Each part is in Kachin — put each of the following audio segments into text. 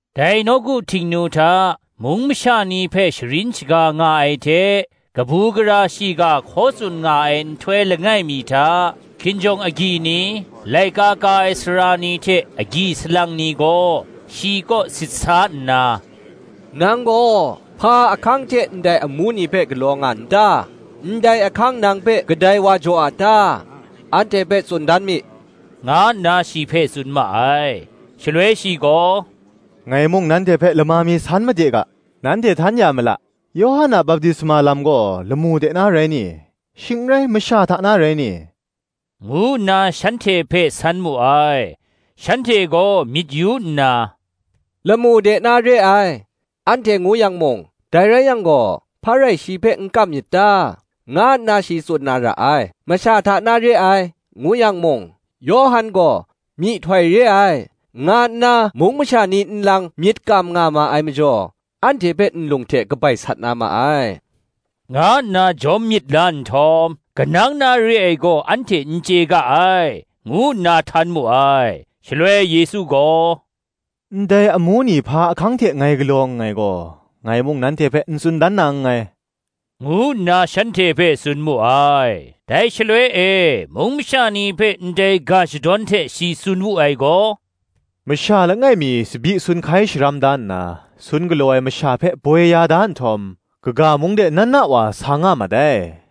Dai nawku Htingnu hta, mung masha ni hpe sharin shaga nga ai hte kabu gara shiga hkaw tsun nga ai nhtoi langai mi hta, hkinjawng agyi ni, laika ka ai sara ni hte agyi salang ni gaw, shi kaw sit sa nna, “Nang gaw hpa ahkang hte ndai amu ni hpe galaw nga n ta? ndai ahkang nang hpe kadai wa jaw a ta? anhte hpe tsun dan mi,” nga nna shi hpe tsun ma ai. Shaloi shi gaw, “Ngai mung nanhte hpe lama mi san made ga, nanhte htan ya ma la: Yawhan a baptisma lam gaw, lamu de na rai ni? shing n rai, masha hta na rai ni?” ngu nna shanhte hpe san mu ai. Shanhte gaw myit yu nna, “Lamu de na re ai, anhte ngu yang mung, Dai rai yang gaw, hpa rai shi hpe n kam myit ta? nga nna shi tsun na ra ai: Masha hta na re ai, ngu yang mung, Yawhan gaw myihtoi re ai, nga nna mung masha ni nlang myit kam nga ma ai majaw, anhte hpe nlung hte kabai sat na ma ai,” nga nna jawm myit la nhtawm, “Kanang na re ai gaw anhte n chye ga ai,” ngu nna htan mu ai. Shaloi Yesu gaw, “Ndai amu ni hpa ahkang hte ngai galaw nngai gaw, ngai mung nanhte hpe n tsun dan na nngai,” ngu nna shanhte hpe tsun mu ai. Dai shaloi e mung masha ni hpe ndai ga shadawn hte shi tsun wu ai gaw, “Masha langai mi tsabyi sun hkai sharam da nna, sun galaw ai masha hpe boi ya da nhtawm, kaga mung de na na wa sa nga mat ai.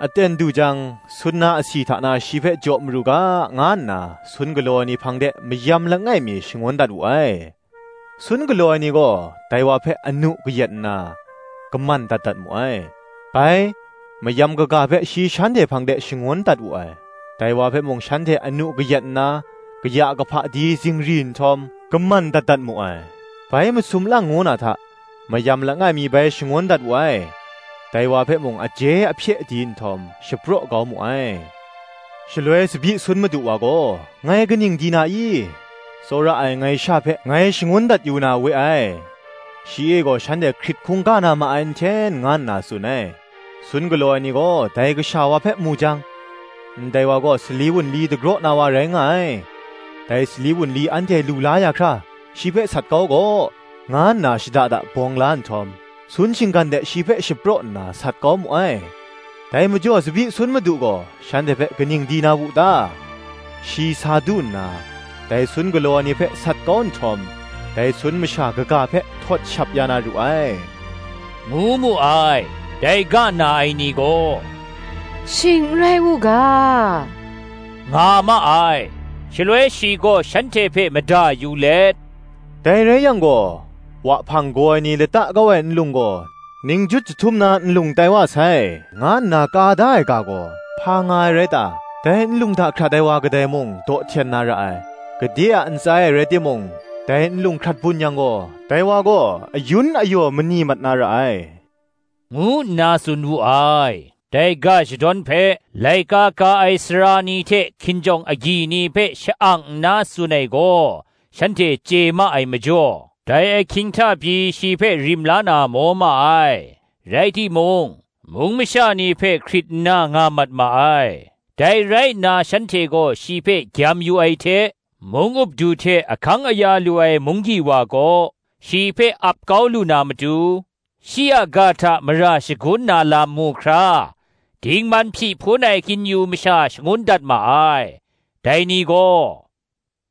Aten du jang, sun na asi hta na shi hpe jaw maru ga, nga nna sun galaw ai ni hpang de mayam langai mi shangun dat wu ai: sun galaw ai ni gaw dai wa hpe anu kayat nna, kaman dat dat mu ai. Bai, mayam kaga hpe shi shanhte hpang de shangun dat wu ai: dai wa hpe mung shanhte anu kayat nna kaya kahpa di zingri nhtawm, kaman dat dat mu ai. Bai masum lang ngu na hta, mayam langai mi bai shangun dat wu ai: dai wa hpe mung aje ahpye di nhtawm, shapraw kau mu ai. Shaloi tsabyi sun madu wa gaw, Ngai kaning di na i? ‘tsawra ai, ngai sha hpe, ngai shangun dat yu na we ai: shi e gaw shanhte hkrit hkungga na ma ai nhten,’ nga nna tsun ai. Sun galaw ai ni gaw dai kasha wa hpe mu jang, ‘Ndai wa gaw sali wunli dagraw na wa rai nga ai; dai sali wunli anhte lu la ya hkra, shi hpe sat kau gaw,’ nga nna shada da bawng la nhtawm, sun shinggan de shi hpe shapraw nna, sat kau mu ai. Dai majaw tsabyi sun madu gaw shanhte hpe kaning di na wu ta? Shi sa du nna, dai sun galaw ai ni hpe sat kau nhtawm, dai sun masha kaga hpe htawt shap ya na ru ai,” ngu mu ai. Dai ga na ai ni gaw, “Shing n rai u ga,” nga ma ai. Shaloi shi gaw shanhte hpe mada yu let, “Dai rai yang gaw, ‘Wahpang gaw ai ni lata kau ai nlung gaw, Ningjut jahtum na nlung tai wa sai,' nga nna ka da ai ga gaw, hpa nga ai rai ta? Dai nlung hta hkrat ai wa kadai mung, daw hten na ra ai; gade a ntsa e rai timung, dai nlung hkrat bun yang gaw, dai wa gaw ayun ayaw mani mat na ra ai,” ngu nna tsun wu ai. Dai ga shadawn hpe laika ka ai sara ni hte hkinjawng agyi ni hpe sha-ang nna tsun ai gaw shanhte chye ma ai majaw, dai ahkying hta pyi shi hpe rim la na maw ma ai, rai timung, mung masha ni hpe hkrit nna nga mat ma ai. Dai rai nna shanhte gaw shi hpe gyam yu ai hte, mung up du hte ahkang aya lu ai munggyi wa kaw, shi hpe ap kau lu na matu, shi a ga hta mara shagun na lam mu hkra, dingman hpyi hpun ai kin-yu masha shangun dat ma ai. Dai ni gaw,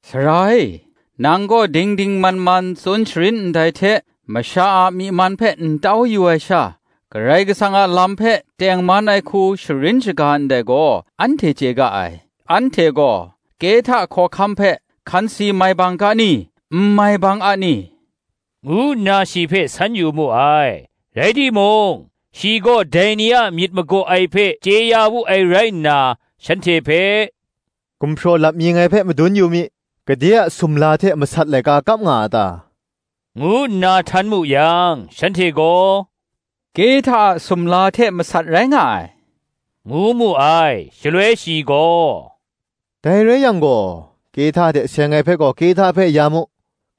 “Sara e, nang gaw ding ding man man tsun sharin ndai hte, masha a myi man hpe n tau yu ai sha, Karai Kasang a lam hpe tengman ai hku sharin shaga ndai gaw, anhte chye ga ai: anhte gaw Kehta hkawhkam hpe hkansi mai bang ga ni? n mai bang a ni?” ngu nna shi hpe san yu mu ai. Rai timung, shi gaw dai ni a myit magaw ai hpe chye ya wu ai rai nna, shanhte hpe, “Gumhpraw lap mi ngai hpe madun yu mi; gade a sumla hte masat laika kap nga a ta?” ngu nna htan mu yang, shanhte gaw, “Kehta a sumla hte masat rai nga ai,” ngu mu ai. Shaloi shi gaw, “Dai rai yang gaw, Kehta hte seng ai hpe gaw, Kehta hpe ya mu: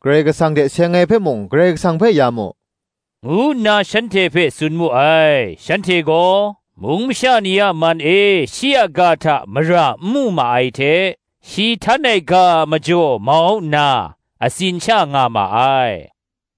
Karai Kasang hte seng ai hpe mung, Karai Kasang hpe ya mu,” ngu nna shanhte hpe tsun mu ai. Shanhte gaw, mung masha ni a man e shi a ga hta mara n mu ma ai hte, shi htan ai ga a majaw mau nna, atsin sha nga ma ai.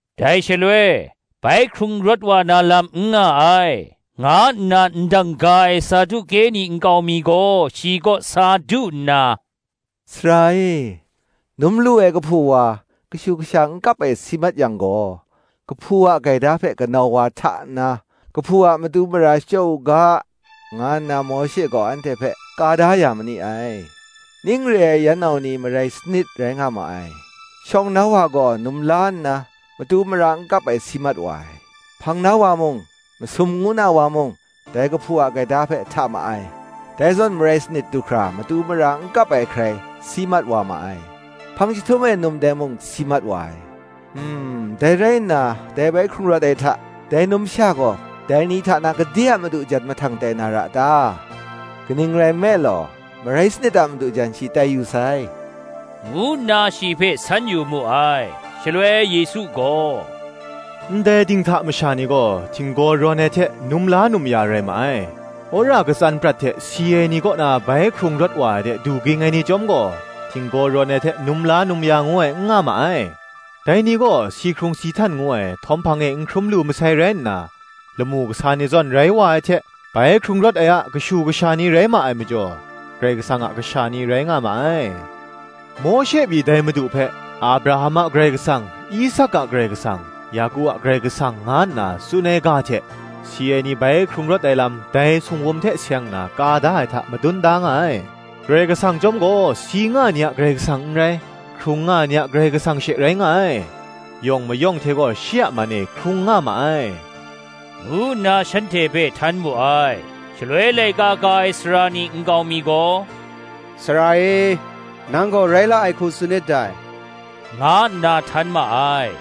Dai shaloi, ‘Bai hkrung rawt wa na lam n nga ai,’ nga nna ndang ga ai Saduke ni nkau mi gaw shi kaw sa du nna, “Sara e, num lu ai kahpu wa, kashu kasha n kap ai si mat yang gaw, kahpu a gaida hpe kanau wa hta nna, kahpu a matu mara shachyaw u ga, nga nna Mawshe gaw anhte hpe ka da ya ma ni ai. Ning re ai yan nau ni marai sanit rai nga ma ai: shawng na wa gaw num la nna, matu mara n kap ai, si mat wa ai; hpang na wa mung, masum ngu na wa mung, dai kahpu a gaida hpe hta ma ai: dai zawn marai sanit du hkra matu mara n kap ai hkrai, si mat wa ma ai: hpang jahtum e num dai mung si mat wa ai. Dai rai nna, dai bai hkrung rawt ai hta, dai numsha gaw dai ni hta na, gade a madu jan mahtang tai na ra ta? kaning rai nme law, marai sanit a madu jan shi tai yu sai,” ngu nna shi hpe san yu mu ai. Shaloi, Yesu gaw, Ndai dinghta masha ni gaw, “htinggaw rawn ai hte, num la num ya rai ma ai: wora katsan prat hte si ai kaw na bai hkrung rawt wa ai de du ging ai ni chyawm gaw, htinggaw rawn ai hte num la num ya ngu ai n nga ma ai: dai ni gaw si hkrung si htan ngu ai htawm hpang e n hkrum lu masai rai nna, lamu kasa ni zawn rai wa ai hte, bai hkrung rawt ai a kashu kasha ni rai ma ai majaw, Karai Kasang a kasha ni rai nga ma ai. Mawshe pyi dai Madu hpe, Abraham a Karai Kasang, Isak a Karai Kasang, Yaku a Karai Kasang nga nna tsun ai ga hte, si ai ni bai hkrung rawt ai lam dai singwum hte seng nna ka da ai hta, madun da nga ai. Karai Kasang chyawm gaw si nga ai ni a Karai Kasang n rai, hkrung nga ai ni a Karai Kasang she rai nga ai: yawng mayawng hte gaw, shi a man e hkrung nga ma ai,” ngu nna shanhte hpe htan mu ai. Shaloi laika ka ai sara ni nkau mi gaw, “Sara e, nang gaw rai la ai hku tsun nit dai,” nga nna htan ma ai.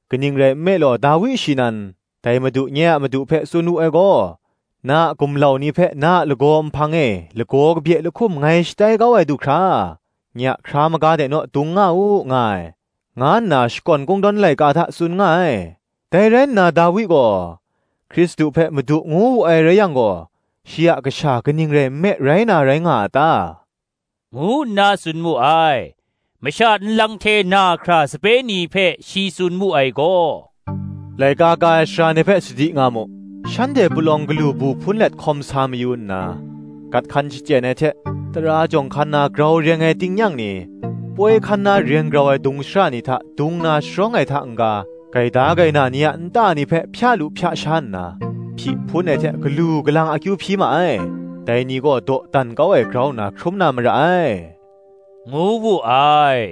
Kaning rai nme law, Dawi shi nan, ‘Dai Madu nye a madu hpe tsun wu ai gaw, Na a gumlau ni hpe, na a lagaw nhpang e, lagaw kabye lahkum ngai shatai kau ai du hkra, Nye a hkra maga de naw dung nga u,’ nga ai, nga nna Shakawn Kungdawn Laika hta tsun nga ai, Dai rai nna Dawi gaw, Hkristu hpe, Madu ngu wu ai rai yang gaw, shi a kasha kaning rai nme rai na rai nga a ta? ngu nna tsun mu ai.” Masha nlang hte na hkra sape ni hpe shi tsun mu ai gaw, “Laika ka ai sara ni hpe sadi nga mu: shanhte palawng galu bu hpun let hkawm sa mayu nna, gat hkan shachyen ai hte, tara jawng hkan na reng grau ai tingnyang ni, poi hkan na reng grau ai dung shara ni hta dung na sharawng ai hta n-ga, gaida gaina ni a nta ni hpe hpya lu hpya sha nna, hpyi hpun ai hte galu galang akyu hpyi ma ai: dai ni gaw dawdan kau ai grau nna hkrum na mara ai,” ngu wu ai.